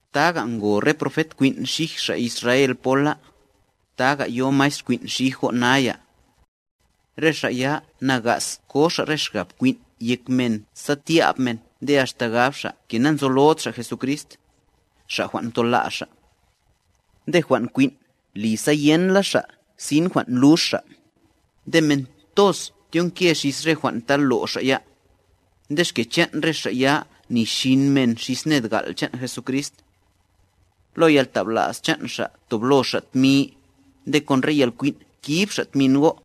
Taga ngo re profet kwin' xij xa' Israel pola, taga yo maestr kwin' xij go' naya. Re xa' ya nagas ko xa' re xgab kwin' yek men sa tya'b men nde axta gab xa' ke nanzolod xa' Jesucrist, Xa' jwan' mtola' xa'. Nde jwan' kwin' li sa yenla xa' sin jwan' lux xa'. Nde men toz tyonke xis re jwan' ta lo' xa' ya, nde xke chan' re xa' ya nixin men xis ned gal' chan' Jesucrist. Lo yaltabla's chan' xa' toblo xa' tmi, nde kon re yalkwin' kib xa' tmin go'.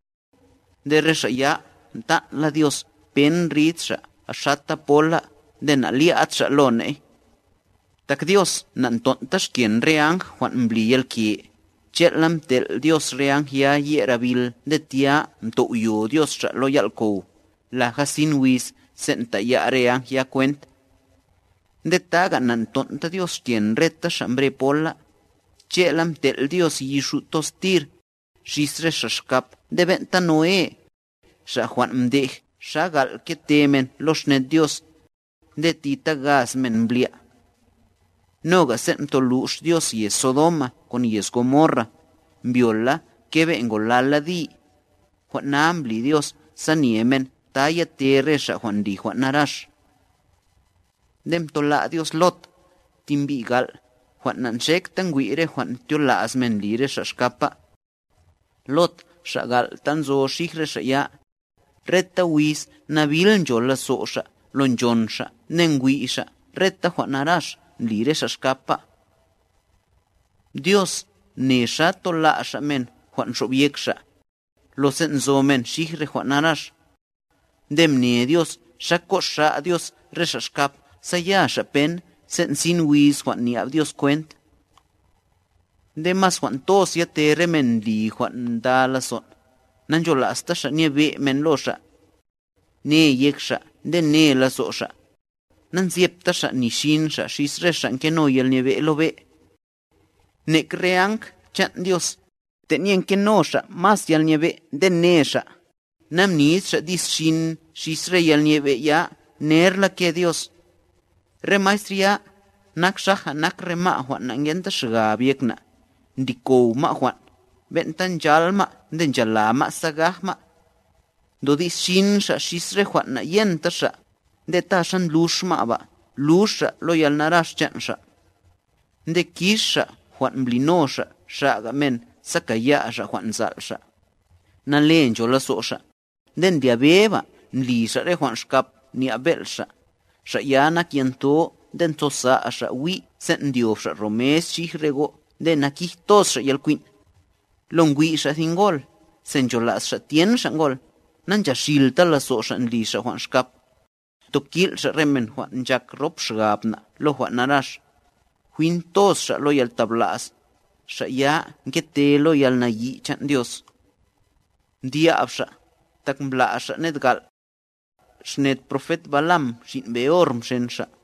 Nde re xa' ya mtan'la Dios pen rid xa' xata pola nde na'lya'd xa' lo ne'y. Tak Dios na'nton'ta xken re áng jwan' mbli yalke, che'la mtel' Dios re áng ya ye'r abil nde tya mtow'yo Dios xa' lo yal'kow, laja sin wiz sen' taya' re áng ya kwent. Nde taga' na'nton'ta Dios xken reta xa' mbre pola, che'la mtel' Dios yi xu' toz tir, xis re xa' xkap nde ben'ta Noé, xa' jwan' mdej xa gal' kete men lo xned Dios, nde ti ta gaz men mblya'. Noga sen' mtolux Dios yez Sodoma kon yez Gomorra, mbyol la kebe' ngolal la di, jwan' na mbli Dios sa nye men ta yate re xa' ndli jwan' narax. Nde mtola' Dios Lot, ti mbi' gal', jwan' na'nxekta ngwi' re jwan' tyola's men ndli re xa' xkapa. Lot xa' gal' ta nzo xij re xa' ya, reta wiz nabil ncho lazo' xa' lo nchon xa' nde ngwi' xa' reta jwan' narax ndli re xa' xkapa. Dios mne xa tola' Xa' men jwan' nxobyek Xa', lo sen' nzo men xij re jwan' narax. Nde mne Dios xa koxa' Dios re xa' xkap sa ya xa' pen sen' sin wiz jwan' nya'b Dios kwent. Nde mas jwan toz yate re men ndli jwan' nda lazon', nanchola'sta xa' nyebe' men lo xa'. Ne yek xa' nde ne lazo' xa', nanzyepta xa' ni xin xa' xis re xa' ngeno yalnyebe' lo be'. Nek re áng chan' Dios, tenye ngeno xa' mas yalnyebe' nde ne xa', namnid xa' di's xin xis re yalnyebe' ya nerla ke Dios. Re maestr ya, nak xaja nak re ma' jwan' nangenta xgab yek na', ndli kow ma' jwan', ben'ta nchal ma' nde nchala ma' sa gaj ma'. Ndodi's xin xa' xis re jwan' nayenta xa', nde ta xa ndlux ma' ba, lux xa' lo yalnarax chan' xa'. Nde kix xa' jwan' mblino xa' xa'ga men sa kaya' xa' jwan' nzal' xa'. Nale ncho lazo' xa', nde ndlyabe ba ndli xa' re jwan' xkap nya'b bel' xa', xa' ya nak yantho nde ntosa' xa' wí' sen' ndyob xa' ro mes xij re go' nde nakij toz xa' yalkwin'. Lo ngwi' xa' thi ngol, se nchola's xa' tyen xa' ngol, nanchaxilta lazo' xa' ndli xa' jwan' xkap. Ntokil' xa' re men jwan' nchak rop xgab na' lo jwan' narax, jwin toz xa' lo yaltabla's, xa' ya ngete lo yalnayi' chan' Dios. Mdya'b xa', tak mbla' xa' ned gal'. Xned profet Balaam xin' Beor mxen xa',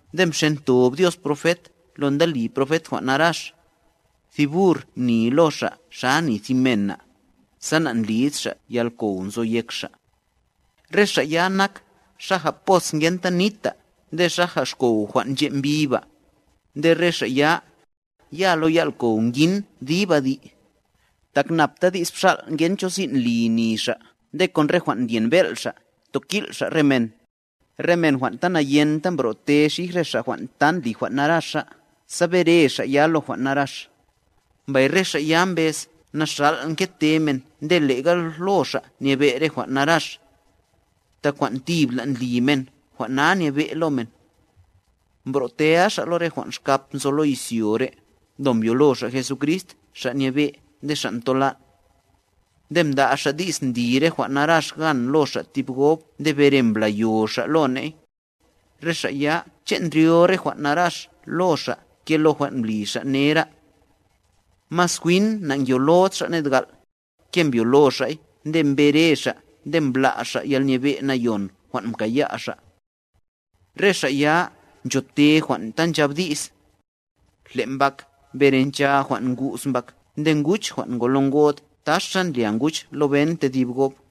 nde mxentob Dios profet lo nda li profet jwan' narax. Thi bur mni lo xa' xa ni thi mena, sa na'ndlid xa' yalkow nzo yek xa'. Re xa' ya nak, xaja pos ngenta nita, nde xaja xkow jwan' nche' mbi ba, nde re xa' ya, ya lo yal'kow ngin dib adi'. Tak nabta di's bxal' ngen cho sin' li ni xa' nde kon re jwan' ndyen bel' xa' ntokil' xa' re men. Re men jwan' ta nayenta mbro'te xij re xa' jwan' ta ndli jwan' naraxa, sa bere xa' ya, lo jwan' narax. Mbay re xa' ya mbez naxàl' nkete men nde le'ga lo xa' nyebe' re jwan' narax. Tak jwan' tibla' ndli men jwan' na nyebe' lo men. Mbro'tea xa' lo re jwan' xkap nzo lo izyo re', lo mbyolo xa' Jesucrist Xa' nyebe' nde Xa' ntolan'. Nde mda' xa' di's ndli re jwan' narax gan lo xa' tib gob nde bere mblayo xa' lo ne'y, re xa' ya che' ndryo re jwan' narax lo xa' ke lo jwan' mbli xa' nera'. Mas jwin na'ngyolod xa' ned gal', ke mbyolo xa'y nde mbere xa' nde mbla' xa' yalnyebe' nayon jwan' mkaya' xa'. Re xa' ya nchote jwan' ta nchab di's: “Le mbak bere ncha jwan' ngu's mbak nde nguch jwan' ngolo ngod taxa ndlya nguch lo ben tedib gob.”